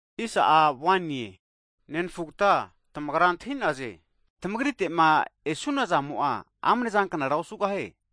Hagi nenafugata tamagra antahi'naze, tamagritegama e'nona zamo'a amnezanknara osugahie.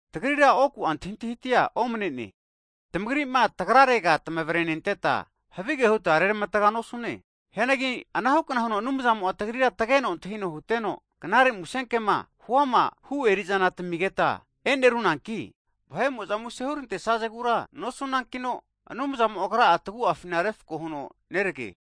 Tagrira oku'a antahintahitia omnene, tamagrira tagrarega tamavrenenteta, havige huta reramatga nosune. Hianagi anahukna huno Anumzamo'a tagrira tageno antahino huteno, Knare Musenkema huama hu erizana, taminegeta e'nerunanki, vahe'mo'za muse hurantesazegura nosunankino, Anumzamo Agra'a tagu'afina refko huno nerage.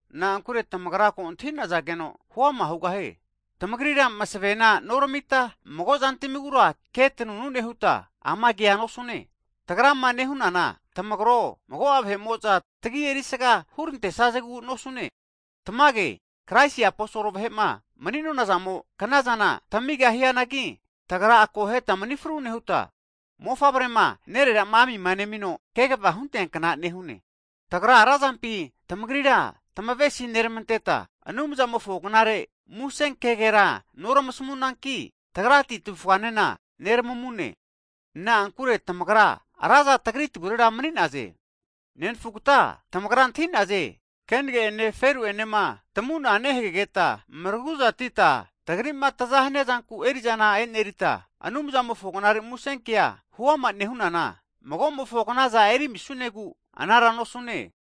Na'ankure tamagra ko antahi'nazageno Anumzamo'enena huama hugahie. Tamagrira masavena noramita, mago zantamigura ke tanunu nehuta ama kea nosune. Tagrama nehunana, tamagro, mago'a vahe'mo'za tagi erisga hurantesazegu nosune. Tamage, Kraisi aposol vahe'ma mani'nonazamo knazana tamigahianagi, tagra akoheta mani fru nehuta, mofavrema nererama amima nemino kegavama hunteankna nehune. Tagra razampi tamagrira tamavesi neramanteta, Anumzamofo Knare Musenkegera noramasamunanki, tagrati tavufganena neramamune. Na'ankure tamagra raza tagri tavurera mani'naze. Hagi nenafugata tamagra antahi'naze, kenage'ene feru'enema tamuna nehagegeta maraguzatita tagrima taza haniazanku erizana e'nerita, Anumzamofo Knare Musenkea huama nehunana, magomofo knaza eri amisunegu anara nosune.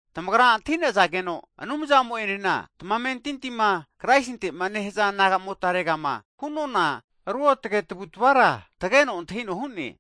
Tamagra antahinazageno, Anumzamo'enena tamamentintima Kraisintema nehaza nagamotare'ma hunona ruotage tavutavara, tageno antahino hu'ne.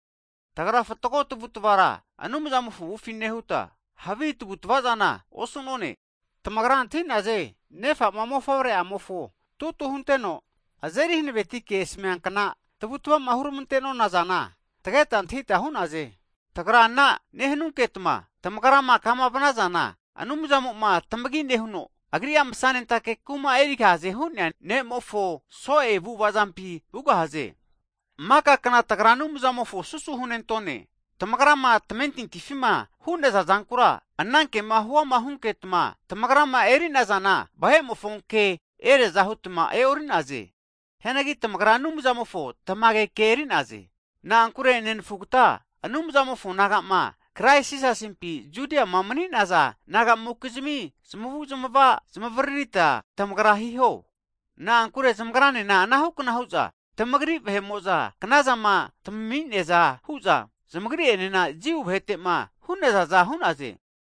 Tagra fatgo tavutavara Anumzamofo avufi nehuta, havi tavutavazana osu'none. Tamagra antahinaze, ne'fama mofavre'amofo tutu hunteno azeri hanaveti ke asamiankna tavutavama huramantenona zana tageta antahita hu'naze. Tagra ana nehanunketma tamagrama kama vnazana, Anumzamo'ma tamagi nehuno, Agri'a masanentake kuma erigahaze hu'nea Ne'mofo so'e kumapi vugahaze. Hagi maka kna tagra Anumzamofona susu hunentone, tamagrama tamamentintima hu'naza zankura, ana kema huama hunketma tamagrama eri'nazana, vahe'mofo kema eriaza hutma e'ori'naze. Hianagi tamagra Anumzamofo tamage ke tamentintima nehaza nagapi eri'zana enerie. Na'ankure nerafugta, Anumzamofo nagama Krais Jisasimpi Judiama mani'naza naga'mokizmi zamavuzmava zamavaririta tamagra hiho. Na'ankure zamagranena anahukna hu'za tamagri vahe'mo'za knazama tamami'neaza huza, zamagri'enena Jiu vahete'ma hu'nazaza hu'naze.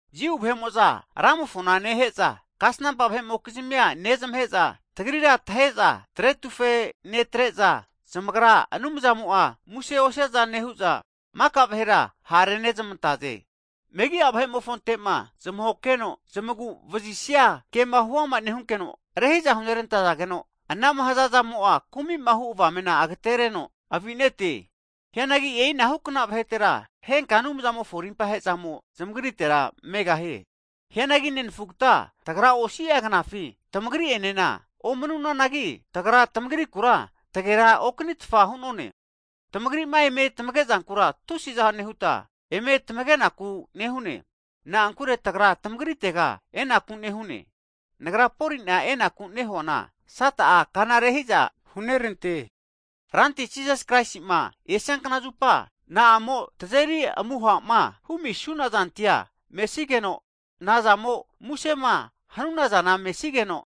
Jiu vahe'mo'za Ramofona nehe'za, kasnampa vahe'mokizmia nezmahe'za, tagrira tahe'za tretufe netre'za, zamagra Anumzamo'a muse osiaza nehu'za, maka vahera ha'rezmante'naze. Megi'a vahe'mofonte'ma zamahokeheno zamaguvazisia kema huama nehunkeno, rehi'za hunerantazageno, anama hazazamo'a kumi'ma hu'zana rama'a hazageno agatereno avite'ne. Hianagi e'inahukna vahetera, henka Anumzamofo rimpahezamo zamagritera megahie. Hianagi nenafugata tagra osia knafi tamagri' enena omanunanagi, tagra tamagrikura tagera okanitfa hu'none. Tamagrima eme tamagezankura tusiza nehuta, eme tamagenaku nehune. Na'ankure tagra tamagritega enaku nehune. Hianagi nagra Poli'na enaku nehuana, Sata'a kana rehiza hunerante. Ranti Jisas Kraisi'ma esia knazupa, na'amo tazeri amuhama humisunazantia mesigeno, nazamo musema hanunazana mesigeno,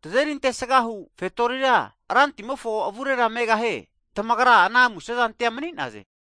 tazeri antesgahu kini fetoritia Rantimofo avurera megahie? Tamagra ana musezantia mani'naze.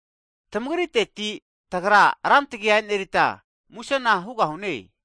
Tamagriteti, tagra ra tagi enerita musena hugahune.